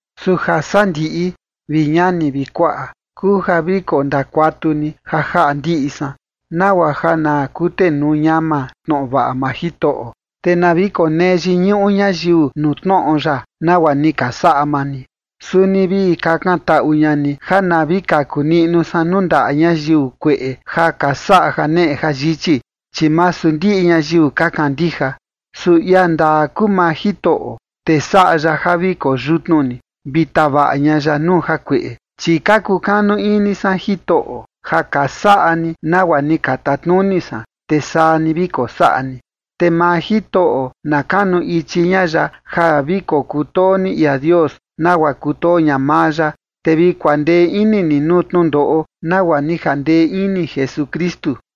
Su jasandiꞌi, vi ñani vi kuaꞌa, kuu ja vi kondakuatu ni ja jaꞌa ndiꞌi san, nagua ja na kutenuu ñama tnoꞌo vaꞌa maa Jitoꞌo, te na vi konee yiñuꞌu ñayiu nuu tnoꞌo ya, nagua ni ka saꞌa maa ni. Suni vi kakantaꞌu ña ni ja na vi kaku niꞌnu san nuu ndaꞌa ñayiu kueꞌe ja ka saꞌa janeꞌe jayichi, chi masu ndiꞌi ñayiu ka kandija. Su ia ndaa kuu maa Jitoꞌo, te saꞌa ya ja vi koo yutnu ni, vi tavaꞌa ña ya nuu jakueꞌe. Chi ka kukanu ini san Jitoꞌo ja ka saꞌa ni nagua ni ka tatnuni san, te saa ni vi kosaꞌa ni. Te maa Jitoꞌo na kanu ichi ña ya ja vi kokutoo ni ia Dios nagua kutoo ña maa ya, te vi kuandee ini ni nuu tnundoꞌo nagua ni jandee ini Jesukristu.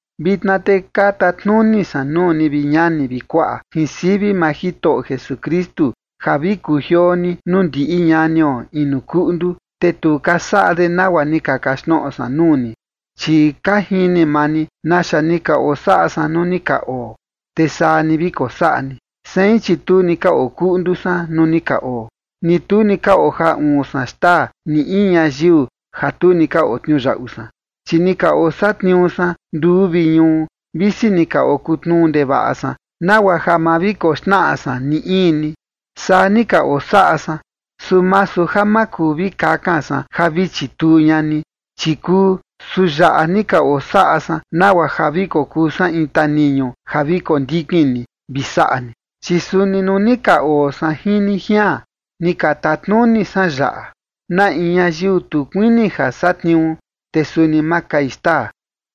Vitna te ka tatnuni san nuu ni, vi ñani vi kuaꞌa, jin sivi maa Jitoꞌo Jesukristu, ja vi kujioo ni nuu ndiꞌi ñanio inu kuꞌndu, te tu ka saꞌa de nagua ni ka kaxtnoꞌo san nuu ni. Chi ka jini maa ni naxa ni ka osaꞌa san nuu ni ka oo, te saa ni vi kosaꞌa ni. Sein, chi tu ni ka okuꞌndu san nuu ni ka oo, ni tu ni ka ojaa uun san xtaa ni in ñayiu ja tu ni ka otniuyaꞌu san, chi ni ka osatniuu san nduu vi ñuu, visi ni ka okutnuu ndevaꞌa san, nagua ja ma vi koxnaꞌa san ni in ni. Saa ni ka osaꞌa san. Su masu ja ma kuu vi kakan san ja vi chituu ña ni, chi kuu, su yaꞌa ni ka osaꞌa san nagua ja vi kokuu san in taniñu ja vi kondikin ni vi saꞌa ni. Chi suni nuu ni ka oo san jin ni jian, ni ka tatnuni san yaꞌa: Na in ñayiu tu kuini ja satniuu, te suni ma kai xtaa.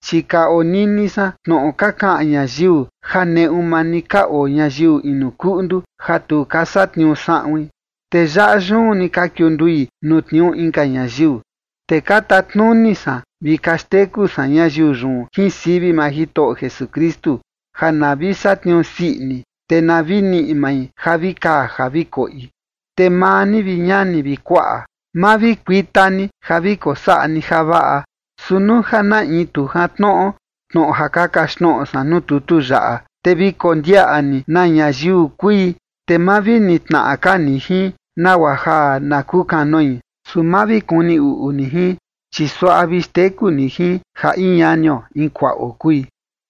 Chi ka onini san tnoꞌo ka kaꞌan ñayiu ja neꞌu maa ni ka oo ñayiu inu kuꞌndu ja tu ka satniuu saꞌuin, te yaꞌa yun ni ka kiundui nuu tniuu inka ñayiu. Ka tatnuni san vi ka xteku san ñayiu yun jin sivi maa Jitoꞌo Jesukristu ja na vi satniuu sii ini, te na vi niꞌi mai ja vi kaa ja vi koꞌi. Te maa ni, vi ñani vi kuaꞌa, ma vi kuita ni ja vi kosaꞌa ni javaꞌa. Su nuu ja na in tu jantnoꞌo tnoꞌo ja ka kaxtnoꞌo san nuu tutu yaꞌa, te vi kondiaꞌa ni na ñayiu kui, te ma vi nitnaꞌa ka ni jin, nagua ja na kukanoi. Su ma vi kuni uꞌu ni jin, chi suaꞌa vi xteku ni jin ja in ñanio in kuaꞌo kui.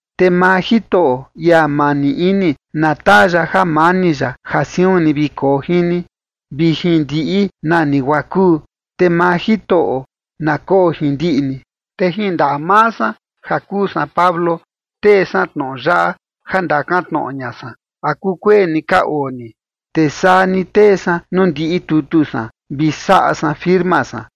Te maa Jitoꞌo, ia mani ini, na taa ya jamani ya, ja siun ni vi koo jin ni vi jin ndiꞌi nani guaa kuu. Te maa Jitoꞌo na koo jin ndiꞌi ni. Te jin ndaꞌa maa san ja kuu san Pablo tee san tnoꞌo yaꞌa, ja ndakan tnoꞌo ña san, ¿a kukueni ka oo ni? Te saa ni tee san nuu ndiꞌi tutu san vi ni saꞌa san firma san.